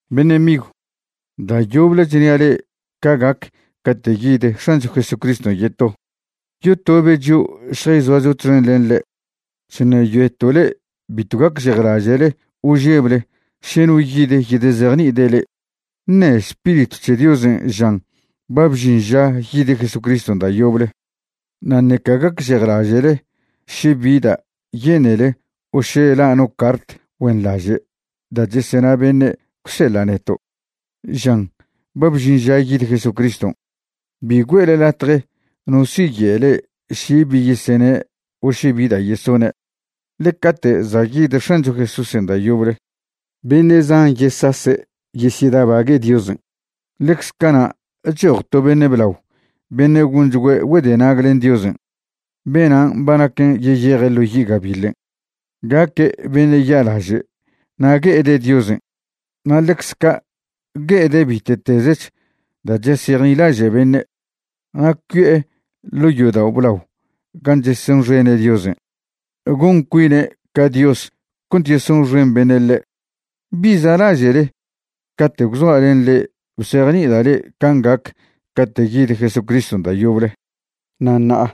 Beṉe' migw, da' yoble chnia' le'e ca gac cate' yid X̱ancho Jesucriston' yeto, yotobe' chio' šjayzoacho txen len ḻe'. Chṉeyoeto' le'e bitw gacžejlaže'le o žeble še no yid yedezejni'ide' le'e, ṉe' Spiritw c̱he Diosen' žan ba bžin ža yid Jesucriston' da' yoble. Na' ṉeca gacžejlaže'le še bi da' yenele o še la' no cart güenḻaže' da' chesena beṉe' gwseḻa' neto', žan ba bžin ža yid Jesucriston'. Bi güe'le latje no siye' le'e še bi yeseṉe' o še bi da' yesone'. Ḻe cate' za' yid X̱ancho Jesúsen' da' yoble, beṉe' zan yesase' yesyedabague' Diosen'. Ḻecze cana' choj to beṉe' blao beṉe' gonchgüe' güedenag len Diosen'. Benan' ba naquen yeyeje' ḻo yi' gabiḻen'. Gaque' beṉe' ya'laže' na' gue'ede' Diosen' na' ḻecz ca' gue'ede' bite'tezech da' chesejnilaže' beṉe'. Na' cui'e ḻo' yodao' blao gan' chesonxene' Diosen', gon cuine' ca Dios cont yesonxen beṉe' ḻe'. ¿Bi za'laže'le cate' gwzoa' len le'e bzejni'ida' le'e can' gac cate' yid Jesucriston' da' yoble? Na' ṉa'a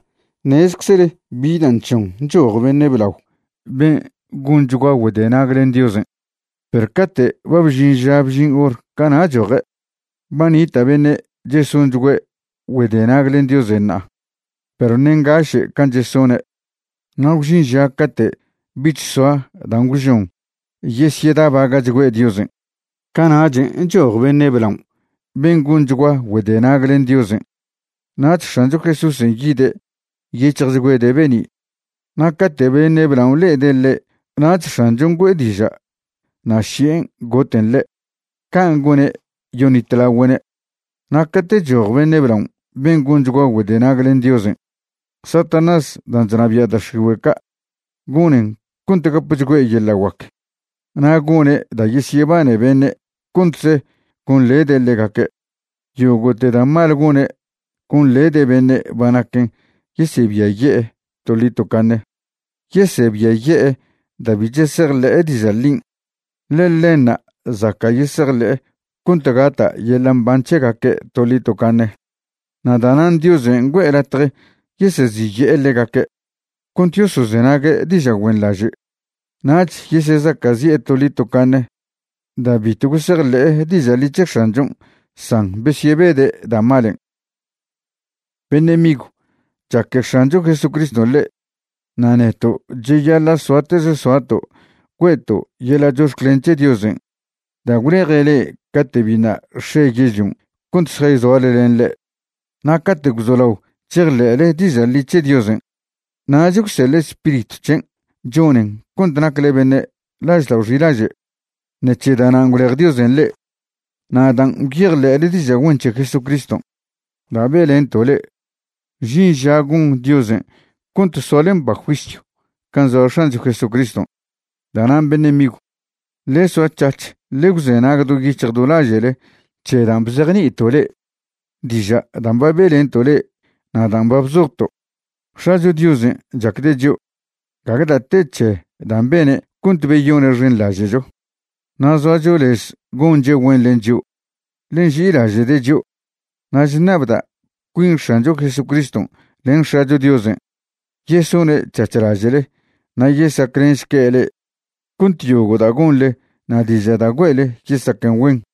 ṉezeczle bi dan' chžon choj beṉe' blao ben' gonchgua güedenag len Diosen', perw cate' ba bžin ža bžin hor, cana' choje'. Ba nita' beṉe' chesonchgüe' güedenag len Diosen' ṉa'a, perw ṉe' ngaše' can' chesone'. Na' gwžin ža cate' bich soa dan' gwžon yesyedabaga'chgüe' Diosen'. Cana'chen' choj beṉe' blaon' ben' gonchgua güedenag len Diosen'. Nach X̱ancho Jesúsen' yide' nyec̱hjchgüede' be'ni', na' cate' beṉe' blaon' le'ede' ḻe' nach X̱anchon' güe'e diža' na' ši'en goten ḻe'. Can' gone' yoṉitlagüe'ne'. Na' cate' choj beṉe' blaon' ben' gonchgua güedenag len Diosen', Satanás dan' chnabia' da' x̱igüe' ca' gonen cont gapchgüe' yeḻa' guac, na' gone' da' yesyebane beṉe' contze gonḻede' ḻegaque'. Yogo'te da' mal gone' gonḻede' beṉe' ba naquen yesebiaye'e toḻi tocaṉe. Yesebiaye'e da' bi chesejḻe'e diža' ḻin', ḻe ḻenṉa' zaca' yesejḻe'e cont gata' yeḻa' mban c̱hegaque' toḻi tocaṉe. Na' da'nan' Diosen' güe'e latje yeseziye'e ḻegaque' cont yosozenague' diža' güenḻaže'. Nach yesezaca'zi'e toḻi tocaṉe da' bitw gosejḻe'e diža' ḻi c̱he X̱anchon' san besyebede' da' malen'. Beṉe' migw, chaque X̱ancho Jesucriston' le'e. Na' neto' cheyaḻa' soatez soato' güe'to' yeḻa' chox̱clen c̱he Diosen' da' gwleje' le'e cate' biṉa' x̱e yežlion' cont šjayzoale len ḻe'. Na' cate' gwzolao chejḻe'le diža' ḻi c̱he Diosen' nach gwseḻe' Spiritw c̱hen' chonen cont nacle beṉe' laždao' xilaže'. Ṉec̱he da'nan' gwlej Diosen' le'e, na' dan' gwyejḻe'le diža' güen c̱he Jesucriston' da' be'lento' le'e, žin ža gon Diosen' cont soale mba juisyw can' zoa X̱ancho Jesucriston'. Da'nan' beṉe' migw, ḻe soa c̱hac̱h ḻe gwzenag do yic̱hj do laže'le c̱he dan' bzejni'ito' le'e, diža' dan' ba be'lento' le'e na' dan' ba bzojto'. X̱acho Diosen' chacde' chio'. Gague da' te c̱he dan' bene' cont beyone'xenḻaže'cho, na' zoacho lez gonche' güen len chio', ḻe nži'ilaže'de' chio'. Na' chṉabda' cuin X̱ancho Jesucriston' len X̱acho Diosen' yesone' c̱hac̱h laže'le na' yesaclenšque' le'e cont yogo' da' gonḻe na' diža' da' güe'le yesaquen güen.